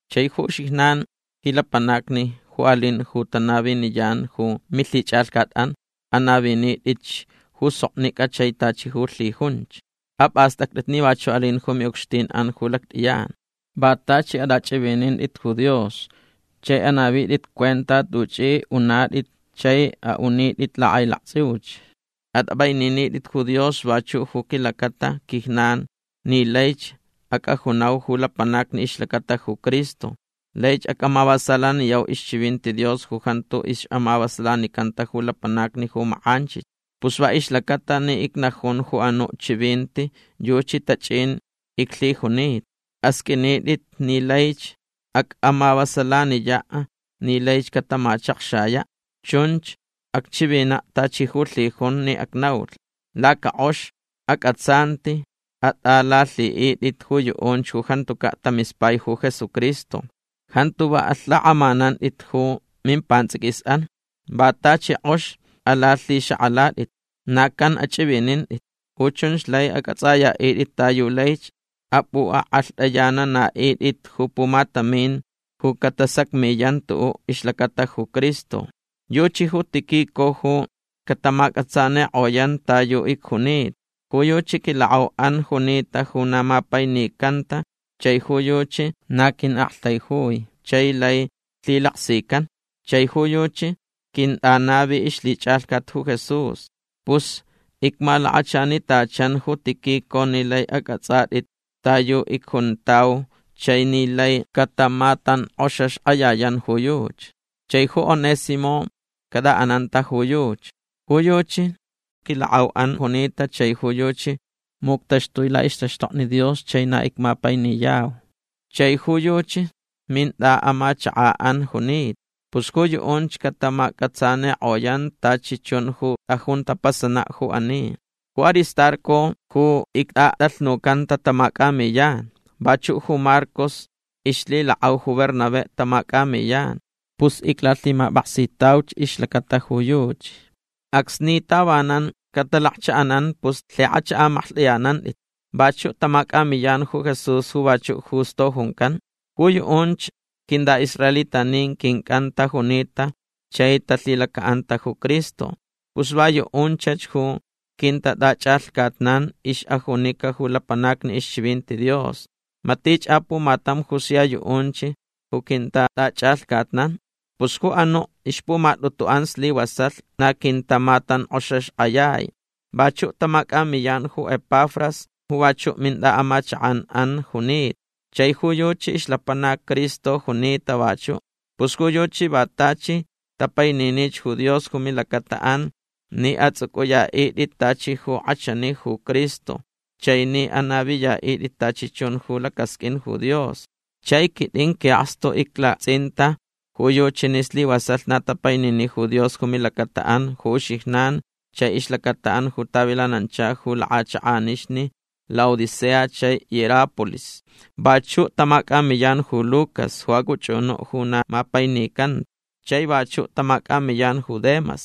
Chai ju uxijnan ji lapanacni ju alin ju tanaviniyan ju milhichʼalhcatʼan anavinitʼitch ju soknicʼa chai tachi ju lhijunch. Apʼastʼactʼit ni vachuʼ alin ju miʼucxtinʼan ju lactʼiyan. Va tachi atʼachʼivinitʼit ju Dios chai anavitʼit cuenta tuchʼi unatʼit chai aʼunitʼit lakʼailaktsʼiuch. Atʼapʼaininitʼit ju Dios vachuʼ ju quilacata quijnan ni laich acʼajunau ju lapanacni ixlacata ju Cristo. Laich acmavasalayau ixchivinti Dios ju jantu ixʼamavasalanicanta ju lapanacni ju makʼanchich. Pus va ixlacata ni icnajun ju anuʼ chivinti yuchi tachʼin iclhijunita. Asqʼuintʼit ni laich acʼamavasalaniyaʼ ni laich catamachakxayaʼ. Chunch acchivinaʼ tachi ju lhijun ni acnaulh. Lacakʼox acʼatsanti atʼalalhiʼitʼit ju yuʼunch ju jantucaʼ tamispai ju Jesucristo. Jantu va alhakʼamanantʼit ju mimpantsʼiquisʼan. Va tachi kʼox alalhixakʼalatʼit. Na can achʼivinintʼit. Ju chunch lai acʼatsʼayaʼitʼit ta yu laich apʼuʼakʼalhtʼayananaʼitʼit ju pumatamin ju catasacmiyan tuʼuʼ ixlacata ju Cristo. Yuchi ju Tíquico ju catamacʼatsanikʼoyan ta yu icjunita. Ju yuchi quilakʼauʼan junita ju na mapainicanta chai ju yuchi na quiʼaktaijui chai lai lhilaksican. Chai ju yuchi quintʼanavi ixlhichʼalhcat ju Jesús. Pus icmalakachanitachan ju Tíquico ni lai acʼatsʼatʼit ta yu icjuntau chai ni lai catamatankʼoxaxkʼayayan ju yuchi. Chai ju Onésimo catʼaʼananta ju yuchi. Ju yuchi quilakʼauʼan junita chai ju yuchi muctaxtui laʼixtaxtokni Dios chai na icmapainiyau. Chai ju yuchi mintʼaʼamachakʼanʼan junita. Pus ju yuʼunch catamacʼatsanikʼoyan tachi chun ju tʼajun tapasanaʼ ju ani. Ju Aristarco ju ictʼatʼalhnucanta tamacʼamiyan. Vachuʼ ju Marcos ixlhilakʼau ju Bernabé tamacʼamiyan. Pus iclalhimapʼaksitauch ixlacata ju yuchi. Acsni tavanan catalakchaʼanan pus lhikʼach amaklhtʼayanantʼit. Vachuʼ tamacʼamiyan ju Jesús ju vachuʼ Justo juncan. Ju yuʼunch quintʼaʼisraelitanin quincʼan tajunita chai talhilacaʼanta ju Cristo. Pus va yuʼunchach ju quintatʼachʼalhcatnan ixʼajunica ju lapanacni ixchivinti Dios. Matich apumatam ju sia yuʼunch ju quintatʼachʼalhcatnan. Pus ju anuʼ ixpumatʼutuʼan slivasalh na quintamatankʼoxaxkʼayai. Vachuʼ tamacʼamiyan ju Epafras ju vachuʼ mintʼaʼamachakʼanʼan junita. Chai ju yuchi ixlapanac Cristo junita vachuʼ. Pus ju yuchi va tachi tapaininich ju Dios ju milacataʼan ni atsʼucʼuyaʼitʼit tachi ju kʼachani ju Cristo chai ni anaviyaʼitʼit tachi chun ju lacasqʼuin ju Dios. Chai quitʼin quiʼakstu iclaktsʼinta ju yuchi ni slivasalh na tapainini ju Dios ju milacataʼan ju uxijnan chai ixlacataʼan ju tavilanancha ju lakʼachakʼanixni Laodicea chai Hierápolis. Vachuʼ tamacʼamiyan ju Lucas ju acʼuchʼunuʼ ju na mapainicanta. Chai vachuʼ tamacʼamiyan ju Demas.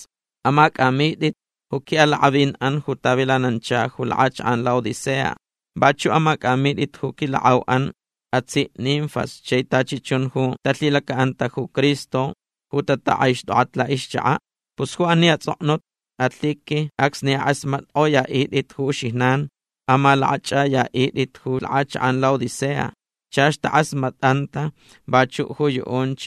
Amacʼamitʼit ju quiʼalakʼavinʼan ju tavilanancha ju lakʼachakʼan Laodicea. Vachuʼ amacʼamitʼit ju quilakʼauʼan atsiʼ Ninfas chai tachi chun ju talhilacaʼanta ju Cristo ju tatakʼaixtʼokʼach laʼixchakaʼ. Pus ju ani atsʼoknut alhiqui acsni akʼasmatkʼoyaʼitʼit ju uxijnan amalakʼachʼayaʼitʼit ju lakʼachakʼan Laodicea. Chach takʼasmatʼanta vachuʼ ju yuʼunch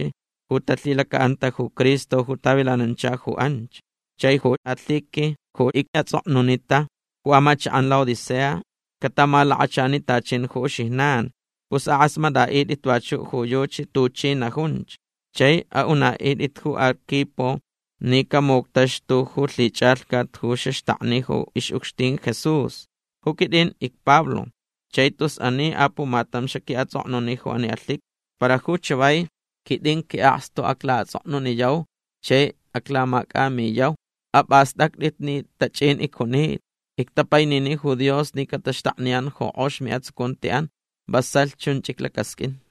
ju talhilacaʼanta ju Cristo ju tavilanancha ju anch. Chai ju alhiqui ju icʼatsʼoknunita ju amachakʼan Laodicea catamalakachanitachin ju uxijnan. Pus akʼasmatʼaʼitʼit vachuʼ ju yuchi tuchi najunch. Chai aʼunaʼitʼit ju Arquipo ni camuctaxtu ju lhichʼalhcat ju xaxtakni ju ixʼucxtin Jesús. Ju quitʼin icPablo chai tus ani apumatam xaquiʼatsʼoknuni ju ani alhiqui. Para ju chavai quitʼin quiʼakstu aclaʼatsʼoknuniyau chai aclamacʼamiyau. Apʼastʼactʼit ni tachʼin icjunita. Ictapainini ju Dios ni cataxtakniyan ju kʼox miʼatsucuntiʼan. Vasalh chunch iclacasqʼuin.